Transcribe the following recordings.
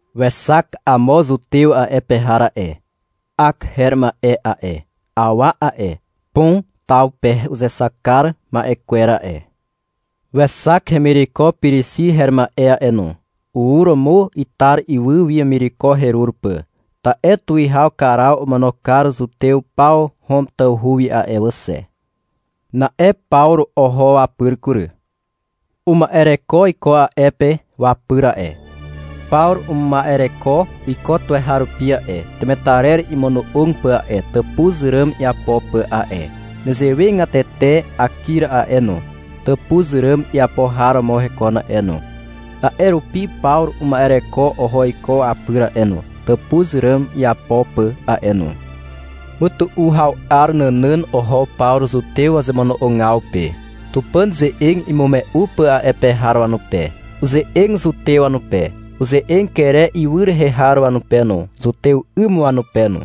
Wexak amo zutew a'e pe har a'e, Ak her ma'e a'e, awa a'e, Pon taw pe uzexak kar ma'e kwer a'e. Wexak hemireko Pirixi her ma'e a'e no. Ur romo Itar ywy wi wemireko herur pà, ta'e tuwihaw Karaw omono kar zutew paw Hom tawhu wi a'e wà xe. Na'e Pawru oho wapyr kury. Uma'ereko iko a'e pe wapyr a'e. Pawru uma'ereko iko tuweharupi a'e, temetarer imono'og pà a'e, tàpuz ràn iapo pà a'e. Nezewegatete Akir a'e no, tàpuz ràn iapo har romo hekon a'e no. A'e rupi Pawru uma'ereko oho iko wapyr a'e no, tàpuz ràn iapo pà a'e no. Mytu'u haw 'ar nànàn oho Pawru zutew wazemono'ogaw pe, Tupàn ze'eg imume'u pà a'e pe har wanupe. Uze'eg zutew wanupe. Uze'eg Kere ywy rehe har wanupe no, zutew 'ym wanupe no.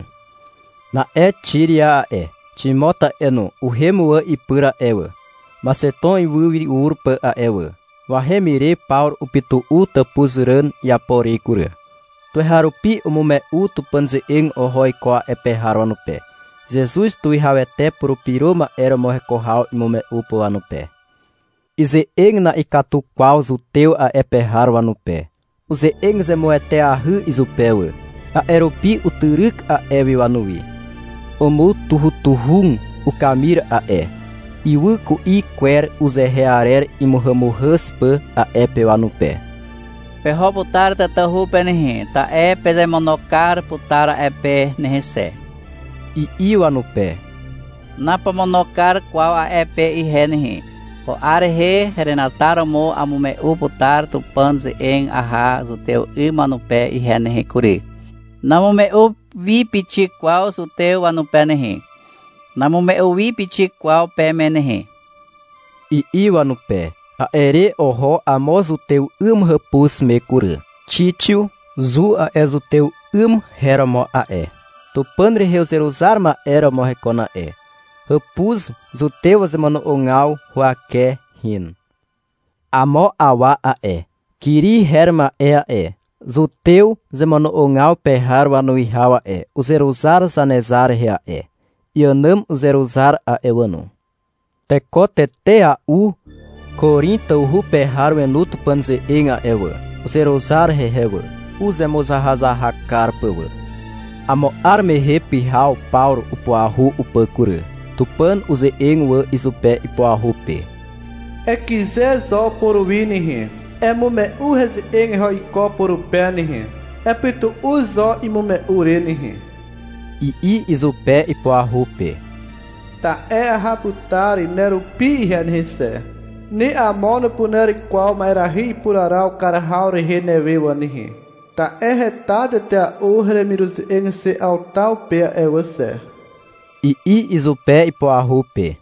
Na'e Xiria a'e, Ximot a'e no, uhem wà ipyr a'e wà, Maxeton ywy wi ur pà a'e wà. Wahem ire Pawru upytu'u tàpuz ràn iapo re kury. Tuweharupi umume'u Tupàn ze'eg oho iko a'e pe har wanupe, Zezuz tuwihawete Purupyro Ma'e romo heko haw imume'u pà wanupe. Ize'eg na'ikatu kwaw zutew a'e pe har wanupe. Uze'eg zemueteahy izupe wà. A'e rupi utyryk a'e wi wanuwi. Umutuhutuhug ukamir a'e, ywy ku'i kwer uzehe arer imuhàmuhàz pà a'e pe wanupe. -Peho putar tatahu pe nehe, ta'e pezemono kar putar a'e pe nehe xe, i'i wanupe. -Napomono kar kwaw a'e pe ihe nehe. Ko 'ar henataromo amume'u putar Tupàn ze'eg aha zutew 'ym wanupe ihe nehe kury. Namume'u wi pixik kwaw zutew wanupe nehe. Namume'u wi pixik kwaw peme nehe, i'i wanupe. A'e re oho amo zutew 'ym hàpuz me kury, Xixiu Zu a'e zutew 'ym her romo a'e. Tupàn rehe uzeruzar ma'e romo hekon a'e. Hàpuz zutew wazemono'ogaw huwake hin. Amo awa a'e, Kiri her ma'e a'e, zutew zemono'ogaw pe har wanuwihaw a'e, uzeruzar Zanezar rehe a'e. Iànàm uzeruzar a'e wà no. Teko tetea'u Korin tawhu pe har wenu Tupàn ze'eg a'e wà. Uzeruzar hehe wà, uzemuzahazahak kar pà wà. Amo 'ar mehe pyhaw Pawru upuahu upà kury. Tupàn uze'eg wà izupe ipuahu pe. — Ekyze zo puruwi nehe, emume'u heze'eg eho iko purupe nehe. Epytu'u zo imume'u re nehe, i'i izupe, ipuahu pe. — Ta'e aha putar nerupi ihe nehe xe. Ni amo nupuner kwaw ma'erahy ipuraraw kar haw rehe newe wà nehe, ta'e heta tetea'u heremiruze'eg xe 'aw taw pe a'e wà xe, i'i izupe ipuahu pe.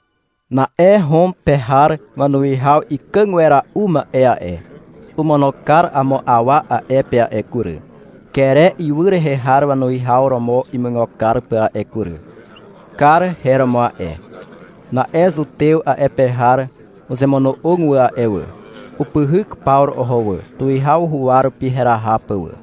Na'e Hom pe har wanuwihaw ikàg wera'u ma'e a'e, omono kar amo awa a'e pe a'e kury, Kere ywy rehe har wanuwihaw romo imuigo kar pà a'e kury. Kar her romo a'e. Na'e zutew a'e pe har uzemono'og wà a'e wà. Upyhyk Pawru oho wà, tuwihaw huwa rupi heraha pà wà.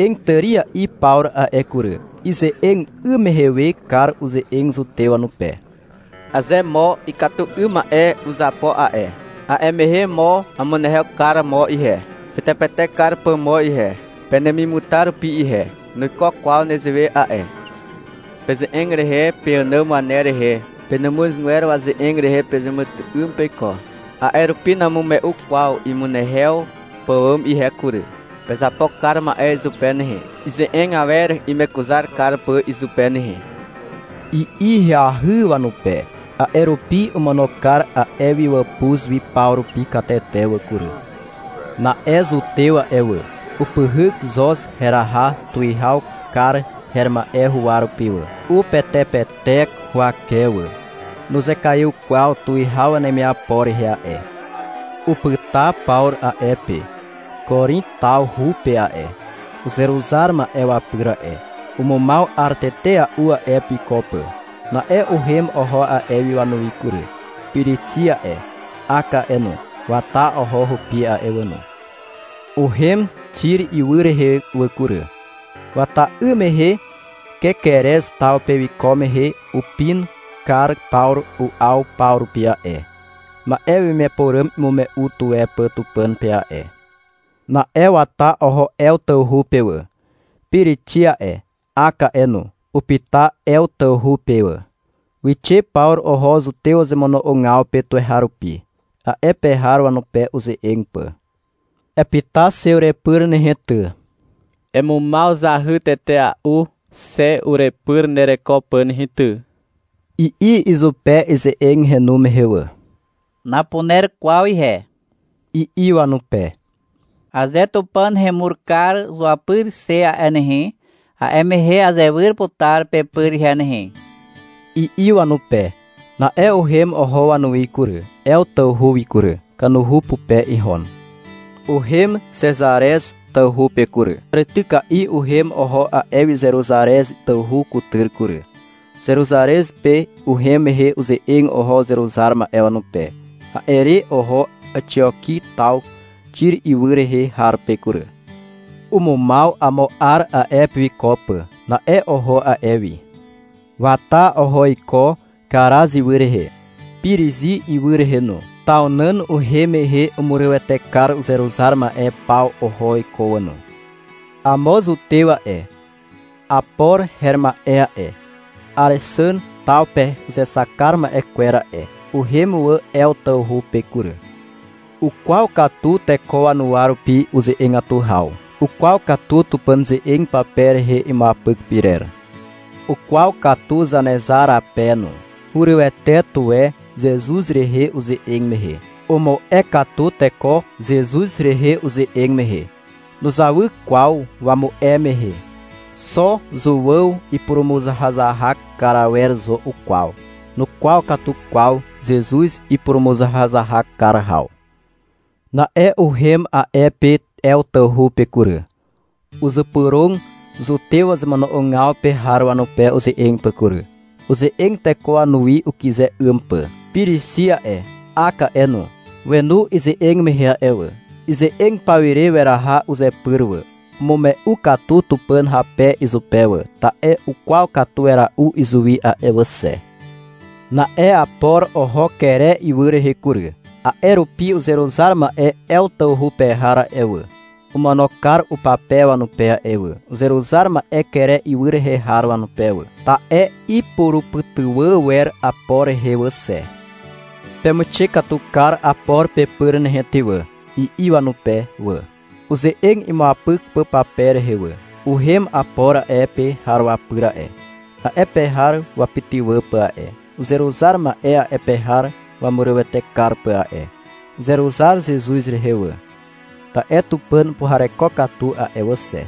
Uze'eg tària'i Pawru a'e kury. Ize'eg 'ym mehe we Kar uze'eg zutew wanupe. — Aze mo ikatu 'ym ma'e uzapo a'e, a'e mehe mo amunehew kar mo ihe, ipetepetek kar pà mo ihe, penemimutar rupi ihe. Nuiko kwaw nezewe a'e. Peze'eg rehe, peànàm waner rehe, penàmuzgwer waze'eg rehe pezeàmàtyry'ym peiko. A'e rupi namume'u kwaw imunehew pàwàm ihe kury. Pezapo kar ma'e izupe nehe, ize'eg awer imekuzar kar pà izupe nehe, i'i ahyahy wanupe. A'e rupi omono kar a'e wi wàpuz wi paw rupi katete wà kury. Na'e zutew a'e wà, upyhyk Xoz heraha tuwihaw Kar her ma'e huwa rupi wà. Upetepetek huwake wà. Nuzekaiw kwaw tuwihaw wanemiapo rehe a'e. Upyta Pawru a'e pe Korin tawhu pe a'e, uzeruzar ma'e wapyr a'e. Umumaw 'ar tetea'u a'e pe wiko pà. Na'e uhem oho a'e wi wanuwi kury. Pirixi a'e, Ak a'e no, wata oho hupi a'e wà no. Uhem Xir ywy rehe wà kury. Wata 'ym mehe Kekerez taw pe wiko mehe, upin kar Pawru u'aw paw rupi a'e, ma'e wemiapo ràm imume'u tuwe pà Tupàn pe a'e. Na'e wata oho Ew tawhu pe wà. Pirixi a'e, Ak a'e no, upyta Ew tawhu pe wà. Wixe Pawru oho zutew wazemono'ogaw pe tuweharupi, a'e pe har wanupe uze'eg pà. — Epyta xe urepyr nehe ty, emumaw zahy tetea'u xe urepyr nereko pà nehe ty, i'i izupe, ize'eg henu mehe wà. — Napuner kwaw ihe, i'i wanupe. — Aze Tupàn hemur kar zuapyri xe a'e nehe, a'e mehe azewyr putar pepyr ihe nehe, i'i wanupe. Na'e uhem oho wanuwi kury, Ew tawhu wi kury. Kanuhu pupe ihon. Uhem Xezarez tawhu pe kury. Tàrityka'i uhem oho a'e wi Zeruzarez tawhu kutyr kury. Zeruzarez pe uhem mehe uze'eg oho uzeruzar ma'e wanupe. A'e re oho Àxioki taw Xir ywy rehe har pe kury. Umumaw amo 'ar a'e pe wiko pà. Na'e oho a'e wi. Wata oho iko Karaz ywy rehe, Pirizi ywy rehe no. Taw nàn uhem mehe umurywete kar uzeruzar ma'e paw oho iko wà no. Amo zutew a'e, Apor her ma'e a'e, Àrexàn taw pe uzexak ma'e kwer a'e, uhem wà Ew tawhu pe kury. Ukwaw katu teko wanuwa rupi uze'egatu haw. Ukwaw katu Tupàn ze'eg pape rehe imuapyk pyrer. Ukwaw katu Zanezar rape no. Hurywete tuwe Zezuz rehe uze'eg mehe. Umu'e katu teko Zezuz rehe uze'eg mehe. Nuzawy kwaw wamu'e mehe. Xo Zuàw ipurumuzahazahak kar awer zo ukwaw. Nukwaw katu kwaw Zezuz ipurumuzahazahak kar haw. Na'e uhem a'e pe Ew tawhu pe kury. Uzypyrog zutew wazemono'ogaw pe har wanupe uze'eg pà kury. Uze'eg teko wanuwi ukyze 'ym pà. Pirixi a'e, Ak a'e no, wenu ize'eg mehe a'e wà. Ize'eg pawire weraha uzepyr wà. Umume'u katu Tupàn hape izupe wà. Ta'e ukwaw katu wera'u izuwi a'e wà xe. Na'e Apor oho Kere ywy rehe kury. A'e rupi uzeruzar ma'e Ew tawhu pe har a'e wà, omono kar upape wanupe a'e wà, uzeruzar ma'e Kere ywy rehe har wanupe wà, ta'e ipurupytywà wer Apor rehe wà xe. — Pemuixe katu kar Apor pepyr nehe ty wà, i'i wanupe wà, uze'eg imuapyk pà pape rehe wà. Uhem Apor a'e pe har wapyr a'e, a'e pe har wapytywà pà a'e, uzeruzar ma'e a'e pe har wamurywete kar pà a'e. Uzeruzar Zezuz rehe wà, ta'e Tupàn upuhareko katu a'e wà xe.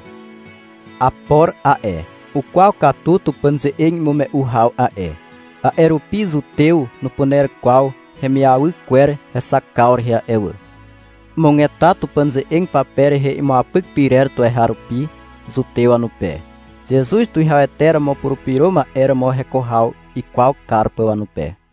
Apor a'e, ukwaw katu Tupàn ze'eg imume'u haw a'e, a'e rupi zutew nupuner kwaw hemiawy kwer hexakaw rehe a'e wà. Umugeta Tupàn ze'eg pape rehe imuapyk pyrer tuweharupi, zutew wanupe, Zezuz tuwihawete romo Purupyro Ma'e romo heko haw ikwaw kar pà wanupe.